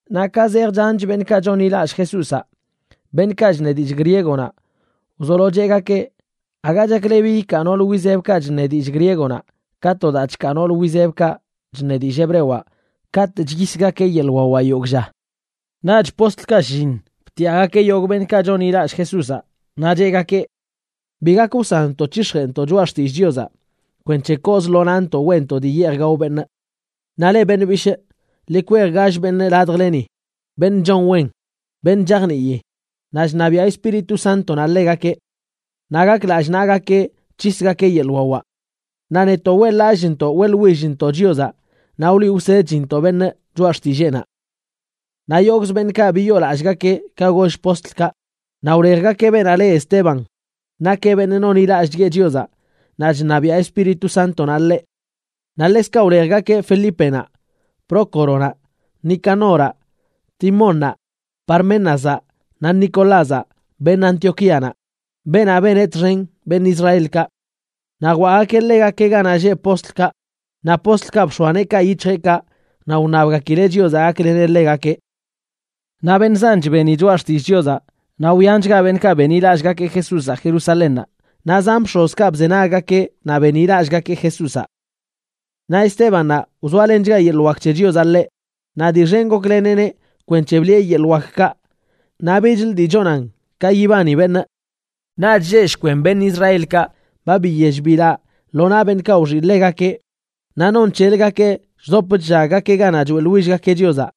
Naꞌ ka zej chanch beṉꞌkaꞌ chonḻilallꞌ Jesúzaꞌ, beṉꞌkaꞌ chṉe dillꞌ griegonaꞌ wzolo cheꞌgakeꞌ aga chaklebi ikaa noolə wizebkaꞌ chṉe dillꞌ griegonaꞌ ka to daa chkaa nool wizebkaꞌ chṉe dillꞌ hebrewaꞌ katꞌ chyisgakeꞌ yeḻꞌ wawaꞌ yogꞌ lla. Naꞌch postlkaꞌ shlliṉ btiꞌagakeꞌ yogꞌ beṉꞌkaꞌ chonḻilallꞌ Jesúzaꞌ, naꞌ cheꞌgakeꞌ: ―Bi gak wsanntoꞌ c̱hix̱jeꞌntoꞌ choꞌa xtillꞌ Chiozaꞌ kwenc̱he kooz lo nantoꞌ weꞌntoꞌ dii yeej gao beṉꞌ. Naꞌ leꞌ beṉꞌ bishꞌ, ḻi kwej gall beṉꞌ ladjleni, beṉꞌ chon wen, beṉꞌ chajnii, naꞌ chṉabiaꞌ Espíritu Sántonaꞌ ḻegakeꞌ. Naꞌ gak lallꞌ naꞌgakeꞌ c̱hisgakeꞌ yeḻꞌ wawaꞌ. Naꞌ netoꞌ weꞌḻ-lallꞌchntoꞌ weꞌḻwillntoꞌ Chiozaꞌ naꞌ wliꞌ wsedchintoꞌ beṉꞌ choꞌa xtilleenaꞌ. Naꞌ yogꞌz beṉꞌkaꞌ biyoolallꞌgakeꞌ ka goll postlkaꞌ, naꞌ wlejgakeꞌ beenaꞌ le Esteban, nakeꞌ beṉꞌ nonḻilallꞌchgueꞌ Chiozaꞌ naꞌ chṉabiaꞌ Espíritu Sántonaꞌ ḻeꞌ. Naꞌ ḻekzkaꞌ wlejgakeꞌ Felípenaꞌ, Prócoronaꞌ, Nicanoraꞌ, Timónnaꞌ, Parménazaꞌ, naꞌ Nicolázaꞌ, beṉꞌ Antioquíanaꞌ, beenaꞌ beneꞌ txen beṉꞌ Israelkaꞌ. Naꞌ jwaꞌgakeꞌ ḻegakeꞌ ganaꞌ lleꞌ postlkaꞌ, naꞌ postlkaꞌ bx̱oa neekaꞌ yic̱hjeꞌkaꞌ naꞌ wṉabgakileꞌ Chiozaꞌ gakleneꞌ ḻegakeꞌ. Naꞌ beṉꞌ zanch beni choꞌa xtillꞌ Chiozaꞌ naꞌ wyanchga beṉꞌkaꞌ benḻilallꞌgakeꞌ Jesúzaꞌ Jerusalénnaꞌ, naꞌ zan bx̱ozkaꞌ bzenaggakeꞌ naꞌ benḻilallꞌgakeꞌ Jesúzaꞌ. Naꞌ Estébannaꞌ, wzoalenchga yeḻꞌ wak c̱he Chiozaꞌ ḻeꞌ, naꞌ dii xen gokleneꞌneꞌ kwenc̱he bliꞌe yeḻꞌ wakkaꞌ naꞌ bichlə dii chonan ka yibani beṉꞌ. Naꞌch lleꞌ shkwen beṉꞌ Israelkaꞌ ba biyell bilaꞌ lo naꞌ beṉꞌkaꞌ wxiꞌ ḻegakeꞌ, naꞌ non c̱heləgakeꞌ chdop chllaggakeꞌ ganaꞌ choeꞌḻwillgakeꞌ Chiozaꞌ.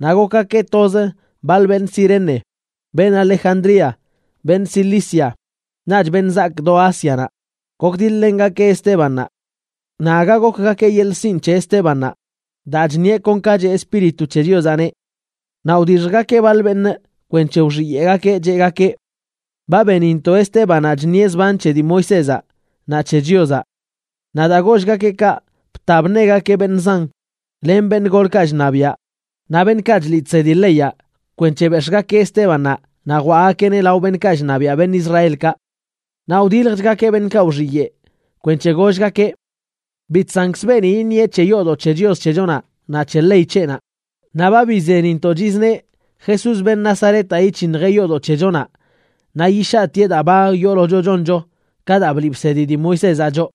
Naꞌ gokgakeꞌ toz baḻ beṉꞌ Cirene, beṉꞌ Alejandría, beṉꞌ Cilicia, naꞌch beṉꞌ zaak do Ásianaꞌ, gokdiḻ-lengakeꞌ Estébannaꞌ. Naꞌ aga gokgakeꞌ yeḻꞌ sinꞌ c̱he Estébannaꞌ, daa chṉieꞌ kon ka cheꞌ Espíritu c̱he Chiozaꞌneꞌ. Naꞌ wdixjgakeꞌ baḻ beṉꞌ kwenc̱he wxiyeꞌgakeꞌ, cheꞌgakeꞌ: “Ba benintoꞌ Estébannaꞌ chṉieꞌ zban c̱he dii Moisézaꞌ naꞌ c̱he Chiozaꞌ.” Naꞌ daa gollgakeꞌ kaꞌ, bta bṉegakeꞌ beṉꞌ zan, len beṉꞌ golkaꞌ chṉabiaꞌ naꞌ beṉꞌkaꞌ chliꞌ chsedi leyaꞌ kwenc̱he bex̱ꞌgakeꞌ Estébannaꞌ naꞌ jwaꞌgakeꞌneꞌ lao beṉꞌkaꞌ chṉabiaꞌ beṉꞌ Israelkaꞌ. Naꞌ wdiljchgakeꞌ beṉꞌkaꞌ wxiyeꞌ, kwenc̱he gollgakeꞌ: ―Bi chsankzə beeni iṉieꞌ c̱he yoodoꞌ c̱he Chios c̱hechonaꞌ, naꞌ c̱he ley c̱heꞌnaꞌ. Naꞌ ba bizenintoꞌ chizneꞌ Jesús, beṉꞌ Nazaretaꞌ, yic̱hiṉjeꞌ yoodoꞌ c̱hechonaꞌ naꞌ yishaꞌtieꞌ daa ba yoolocho choncho ka daa bliꞌ bsedi dii Moisézaꞌ choꞌ.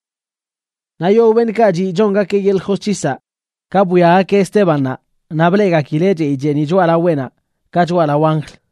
Naꞌ yogꞌ beṉꞌkaꞌ chiꞌ chongakeꞌ yeḻꞌ josc̱hisaꞌ, ka bwiagakeꞌ Estébannaꞌ naꞌ bleꞌgakileꞌ chey cheeniꞌ choꞌalaweꞌnaꞌ ka choꞌalao anjl.